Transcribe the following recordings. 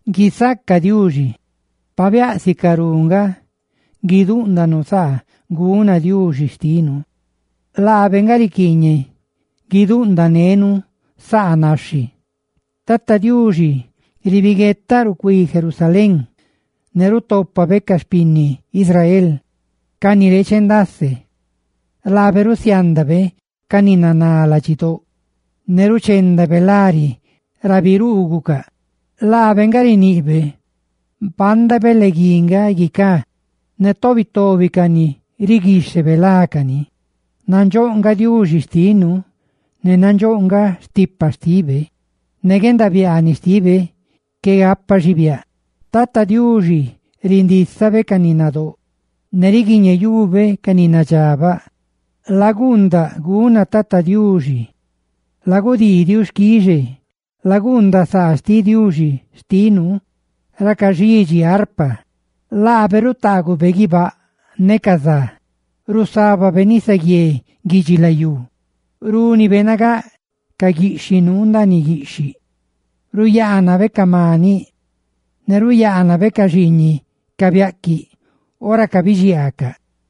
¡Guisaca Diuxi! ¡Pabiáꞌ sicarú nga guidúꞌndanu saa guna Diuxi xtinu! ¡Laabe nga riquiiñeꞌ guidúꞌndanenu saa naxhi! Tata Diuxi biꞌniꞌ chaahuiꞌ Jerusalén xti bieque, ne rutópabe ca xpinni Israel, ca ni reeche ndase. Laabe rusiándabe ca ni naná ladxidóꞌ, ne ruchendabe lari ra biruugucaꞌ. Laabe nga riniꞌbe panda beleguí nga guicá, ne tobi tobi cani riguixhebe lácani. Nandxóꞌ nga Diuxi xtinu, ne nandxóꞌ nga stipa xtibe; ne guendabiaaniꞌ xtibe qué gapa xibiáꞌ. Tata Diuxi rindísabe ca ni nadóꞌ, ne riguiñeyube ca ni nadxabaꞌ. Laguundaꞌ guna Tata Diuxi, ne stale xquixe; laguundaꞌ saa xtiꞌ Diuxi xtinu, ra caxidxi arpa. Laabe rutaagube guibáꞌ ne ca za, rusábabe nisaguié guidxilayú, rúnibe nagáꞌ ca guixi nuu ndaaniꞌ guiꞌxhiꞌ, ruyaanabe ca maniꞌ, ne ruyaanabe ca xiiñiꞌ ca biaꞌquiꞌ ora cabidxiaacaꞌ.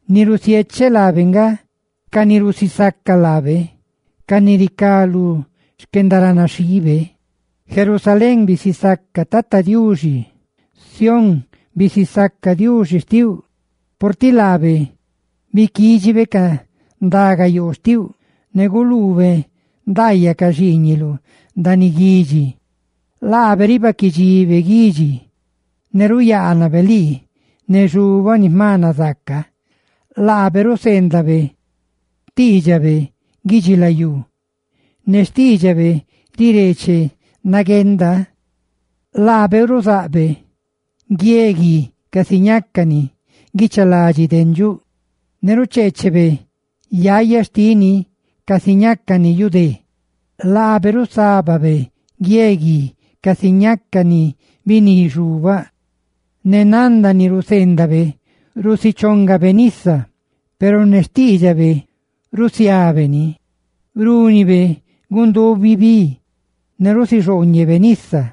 ni rusiecheꞌ laabe nga ca ni rusisaca laabe, ca ni ricá lú xquendaranaxhiibe. Jerusalén, bisisaca Tata Diuxi; Sión, bisisaca Diuxi xtiuꞌ. Purtiꞌ laabe biquídxibe ni rundiibi ca ndagayoo xtiuꞌ, ne guluube ndaayaꞌ ca xiiñiluꞌ ndaaniꞌ guidxi. Laabe ribaꞌquiꞌ dxibe xquídxiluꞌ, ne ruyaanabe lii ne xubaꞌ ni jma nazaaca. Laabe ruseendabe xtiidxabe guidxilayú, ne xtiidxabe rireeche nagueenda. Laabe ruzaꞌbe guie guia casi ñácani guichaladi dendxuꞌ, ne rucheechebe yaya xtini casi ñácani yu dé. Laabe rusábabe guie gui casi ñácani biní xubaꞌ; ne nanda ni ruseendabe, rusichongani nisa. Peru ne xtiidxabe, rusiabe ni; rúnibe gundubi bi, ne rusixooñebe nisa.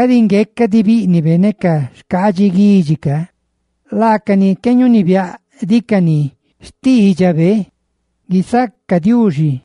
Cadi ngueca diꞌ bíꞌnibe ne xcaadxi guidxi roꞌ ca, laacani qué ñunibiáꞌdicani xtiidxabe. ¡Guisaca Diuxi!